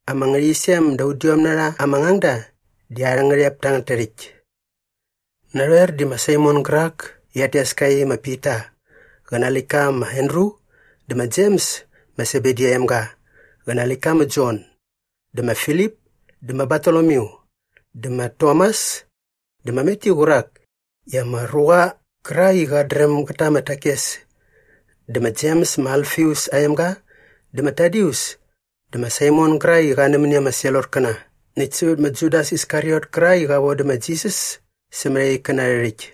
Ama ngärhäqyisem da udiom na rha ama ngangda di arhä ngärhep tangät tärhäkt. Narhoer di ma Saimon gärak i rhat tes ka i ma Pita qä nä aa läktka ma Andru dä ma Jems ma Sebedi aa emga qä na aa läktka ma Jon dä ma Filip dä ma Bartolomyu dä ma Tomas dä ma Matyu qärak i ama ruqa qärak i qat dräm gät ta ama takes dä ma Jems ma Alfius aa emga dä ma Tadius dä ma Saimon gärak i qa nämäni ama Selotkäna näkt sävät ma Judas Iskariot kärak i qa vodä ma Jisas sämät aa ikkäna arhä rhäkt.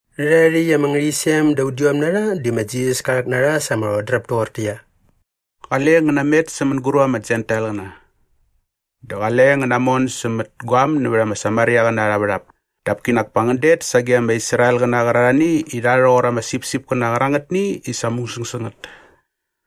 Rhärhae rhäkt ama ngärhäqyisem da udiom na rha di ma Jisas ka rhäk na rha sa ama rhodräp toqortäqyia, “Qale ngän namet sä mänguräp ama Jentailqäna. Dä qale ngän namon sämät guaäm nävät ama Samariaqäna arha värhap. Dap kinak pa ngän det sage ama Israelqäna qärarhani i rha rhoqor ama sipsipkäna qärangätni i sa musäng sä ngät.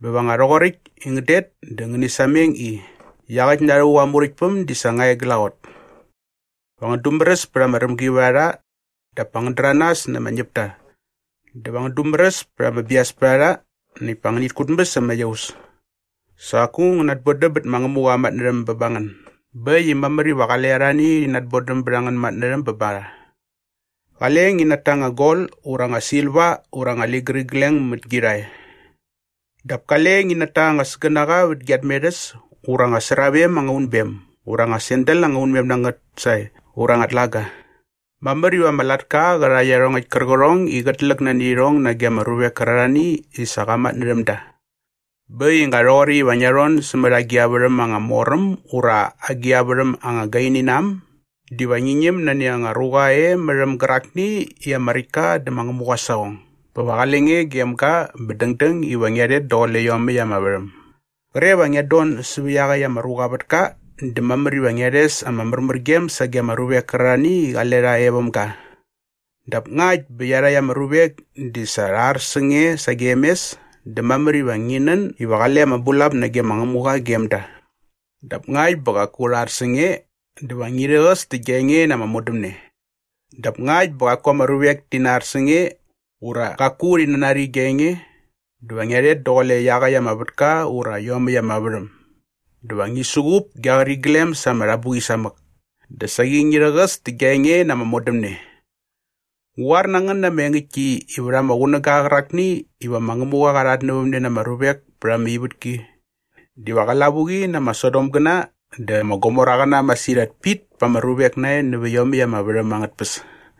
Bä va nga rhoqoräkt i ngän det dä ngäni sameng i, ‘Iaqäkt na rhävuk aa Muräktpäm di sa nga e glaqot.’ Va ngän dumäräs pät ama rämgivärharha dap pa ngän däranas na ama ñäpta dä va ngän dumäräs pät ama biaspärharha näkt pa ngänit kutmäs ama iaus. Sa qaku ngän bodäm bät ma Ngämuqa aa matnärhäm bä ba ngän bä äkt i mamär iva qale arhani rhi natbodäm bät angän matnärhäm bä ba rha. Qale ngi nata anga gol ura anga silva ura anga ligärigleng mät gi rhae. Dap kale ngi nata anga sägänaqa vät gia tmerhäs ura anga sravem anga unbem ura anga sandal anga unmem na ngät sae ura anga tlaga. “Mamär iva ama latka qä rha iarhongäkt kärqärhong i qät läk nani irhong nage ama ruvek kärarhani i sa qa matnärhäm da. Bä äkt i nga rhoqoräkt iva ngia rhon sämät agi a värhäm anga mor äm ura agi a värhäm anga gaini na äm diva ngi ñäm nani anga ruqa e mät äm gärakni i ama räkt ka dä ma Ngämuqa aa saqong bä va qale nge gem ga bä dängdäng iva ngia rhet daqule iomäkt ama värhäm. Qre va ngiat don säva iaqäkt ama ruqa aa vätka dä mamär iva ngia rhes ama märmärgem sage ama ruvek kärarhani i qale rha e väm ga. Dap ngakt bä iarhakt ama ruvek di sa rha ar sä nge sagem mes dä mamär iva ngi nän iva qale ama bulap nage ma Ngämuqa gem da. Dap ngakt bä qaku rha ar sä nge dä va ngi rhäqäs tä gia enge na ama modämne. Dap ngakt bä qaku ama ruvek ti nar sä nge ura qaku rhi nanari gia enge dä va ngia rhet daqule iaqäkt ama vätka ura iomäkt ama värhäm dä va ngi suqup gia qäriglem sa ama rhabuqi samäk dä saqi ngi rhäqäs tä gia enge na ama modämne. Ngu qoar na ngän na ama engäktki i vät ama qunäga qärakni iva ma Ngämuqa qa rhatnävämne na ama ruvek pät ama ivätki diva qä lavuqi na ama Sodomgäna dä ama Gomoraqäna masirhat pit pa ama ruvek nae nävä iomäkt ama värhäm angät tpäs.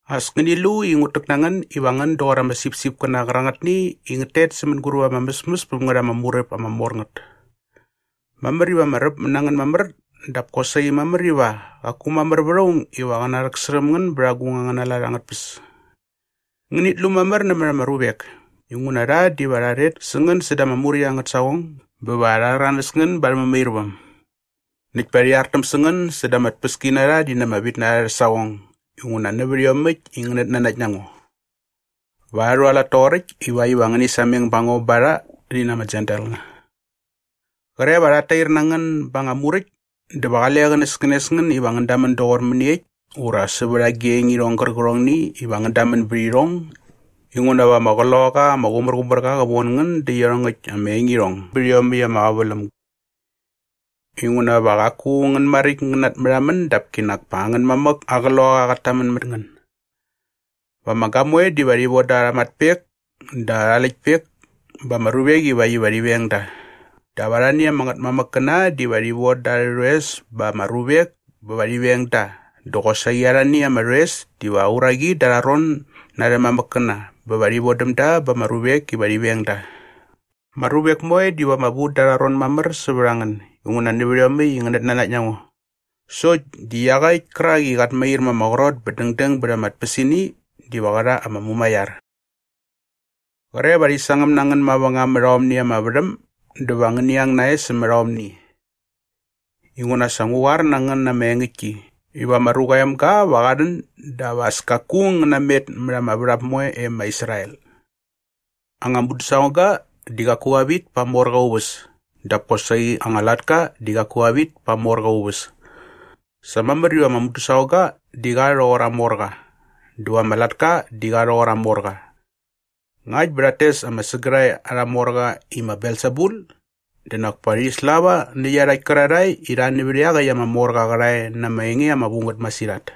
“As ngäni lu i ngut täk na ngän iva ngän doqor ama sipsipkäna qärangätni i ngät tet sä mänguräp ama mäsmäs päm ngät ama muräp ama mor ngät. Mamär iva ama räpmät na ngän mamär dap kosaqi mamär iva qaku mamär vät aung iva qä narhäksärhäm ngän bät agung angäna lat angät tpäs. Ngänit lu mamär nämät ama ruvek inguna rha diva rha rhet sä ngän säda ama muräkt angät saqong bä va rha rhäranäs ngän ba arhä mämairväm. Näkt pa rhi artäm na ngän säda ama tpäskinarha rhi na ama vitnarha arhä saqong inguna nävät iomäkt i ngänät nanakt na ngo. Va rha rhualat toqoräkt ivakt iva ngäni sameng sävät a ngo ba rha rhi na ama Jentailqäna. Qre va rhat tair na ngän ba anga muräkt dä va qale qänäskänes ngän iva ngän damän doqor mäniekt ura sävät agi anga engirhong gärqärhongni iva ngän damän bät irhong inguna va ama Qloqaqa ama Qumärqumärqa qä von ngän dä iarhongäkt ama engirhong bät iomäkt ama qäväläm. Inguna va qaku ngän maräkt ngän natmärhamän dap kinak pa angän mamäk aa Qloqaqa qat tamän mät ngän. “Va ama gamoe diva rhi voda arha matpek dä arha läktpek ba ama ruvek ivakt iva rhi veng da. Dap arhani ama ngätmamäkkäna diva rhi von da arhä rhoes ba ama ruvek bä va rhi veng da dä qosaqi arhani ama rhoes diva uraqi da arha ron na arhä mamäkkäna bä va rhi vodäm da ba ama ruvek bä va rhi veng da. Ama ruvek moe diva ama vu da arha ron na ngän mamär inguna nävät iomäkt i ngänät nanakt na ngo. Sokt di iaqäkt kärak i qat mair ma ama qrot bä däng bät ama tpäsini diva qä rha ama mumaiar. Qre va rhi sangäm na ngän mavängam mät aomni ama värhäm dä va ngäni ang nae sämät aomni. Inguna sa ngu qoar na ngän na ama engäktki iva ma Ruqa aa Emga va qa rhän dap as kaku ngän namet mät ama värhap moe e ma Israel. “Anga mudäsaqongga di qaku qa vit pa aa morqa aa uväs dap kosaqi anga latka di qaku qa vit pa aa morqa aa uväs. Sa mamär iva ama mudäsaqongga di qa rhoqor aa morqa dä va ama latka di qa rhoqor aa morqa. Ngakt bä rhat tes ama sägärhae arha morqa i ma Belsebul dä nak pa rhi slava nä iarhakt kärarhae i rha nävät iaqäkt ama morqa aa qärhae na ama enge ama vu ngät masirhat.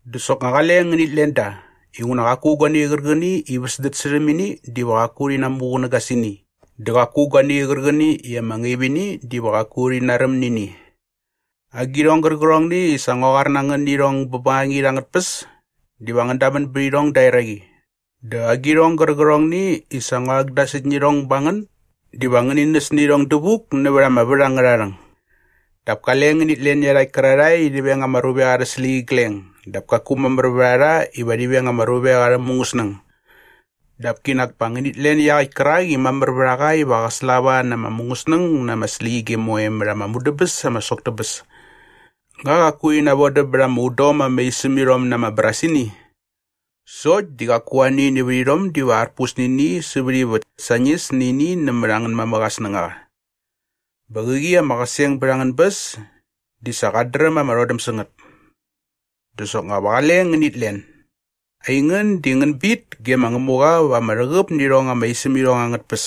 “Dä soknga qale ngänit len da inguna qaku guani qärqäni i sa väsdät särhäm ini diva qaku rhi namuqunäga sä ini dä qaku guani qärqäni i ama ngaip ini diva qaku rhi naräm nä ini. Agirhong gärqärhongni i sa ngua qoar na ngän nä irhong bä bängangit angät tpäs diva ngän damän bät irhong da eraqi dä agirhong gärqärhongni i sa ngua rhäkdasäkt nä irhong ba ngän diva ngäni näs nä irhong dävuk nävät ama vät angärha rhäng. Dap kale ngänit len iarhakt kärarhae i rhi veng ama ruvek arhä släqyigleng dap kaku mamär vät a rha iva rhi veng ama ruvek arhä mungäsnäng. Dap kinak pa ngänit len iaqäkt kärak i mamär vät a qa iva qä slava na ama mungäsnäng ngä na ama släqyige moe mät ama mudäbäs ama sok tä bäs. Nga qaku rhi navodäm bät ama udom ama isämirhom na ama brasini? Sokt di qaku ani nävät irhom diva arpus nä ini sävät ivät sañis nä ini nämät angän mamäk aa snängaqa. Bä qäqi ama qäseng bät angän bäs di sa qat dräm ama rhodäm sä ngät. Dä soknga va qale ngänit len. Aingän di ngän bit ge ma Ngämuqa va ama rhäqäp nä irhong ama isämirhong angät tpäs.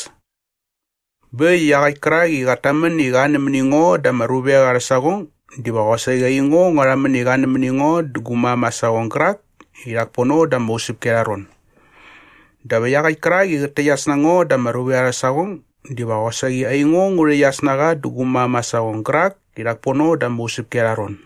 “Bä äkt i iaqäkt kärak i qat tamän i qa nämäni ngo da ama ruvek arhä saqong diva qosaqi aingo ngua rhamän i qa nämäni ngo dä gu mam aa saqong gärak i rhak pono da ama usäpki arha ron. Dap iaqäkt kärak i qät täqyas na ngo da ama ruvek arhä saqong diva qosaqi aingo ngu rhäqyas na qa dä gu mam aa saqong gärak i rhak pono da ama usäpki arha ron.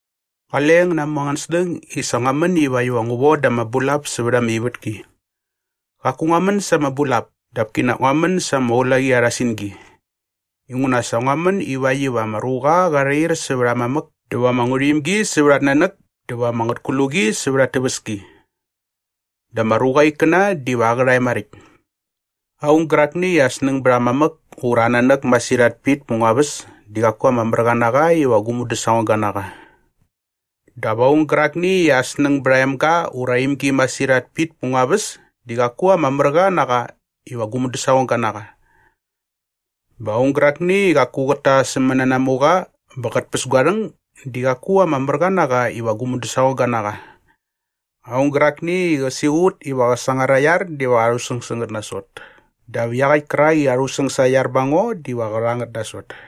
“Qale ngän namu angän snäng i sa ngua män ivakt iva ngu voda ama bulap sävät ama ivätki. Qaku ngua män sa ama bulap dap kinak ngua män sa ama ulaqi arha singi. Inguna sa ngua män ivakt iva ama ruqa qa rhair sävät aa mamäk dä va ama ngärhuimgi sävät at nanäk dä va ama ngätkluqi sävät at täväski. Dä ama ruqa aa ikkäna diva aa qärhae maräkt. “Aung gärakni i aa snäng bät aa mamäk ura aa nanäk masirhat pit pät ngua väs di qaku ama mär qa na qa iva gu mudäsaqongga na qa. Dap aung gärakni i aa snäng bät aa emga ura aa imgi masirhat pit pät ngua väs di qaku ama mär qa na qa iva gu mudäsaqongga na qa. Bä aung gärakni i qaku qät ta aa sämänanamuqa bä qät päs gua rhäng di qaku ama mär qa na qa iva gu mudäsaqongga na qa. Aung gärakni i qä siqut iva qä sangar aa iar diva qa rhusäng sä ngät nasot dap iaqäkt kärak i qa rhusäng sa aa iar bä ba ngo diva qä rha ngät nasot.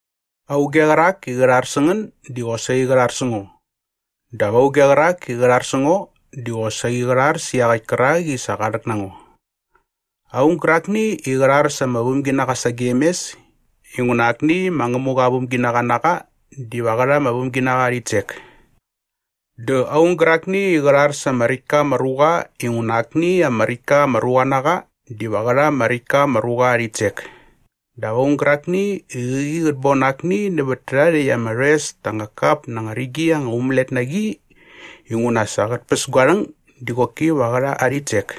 “Auge qärak i qä rhar sä ngän di qosaqi qä rhar sä ngo dap auge qärak i qä rhar sä ngo di qosaqi qä rhar sä iaqäkt kärak i sa qa rhäk na ngo. Aung gärakni i qä rhar sa ama vämginaqa sagem mes inguna akni ma Ngämuqa aa vämginaqa na qa diva qä rha ama vämginaqa aa rhitsek. Dä aung gärakni i qä rhar sa ama räkt ka ama ruqa inguna akni ama räkt ka ama ruqa na qa diva qä rha ama räkt ka ama ruqa aa rhitsek. Dap aung gärakni i qäqi qät bon akni nävät tärhae rhäkt ama rhoes ta anga kap na anga rigi anga umälet na qi inguna sa qät päs gua rhäng di qoki va qä rha aa rhitsek.”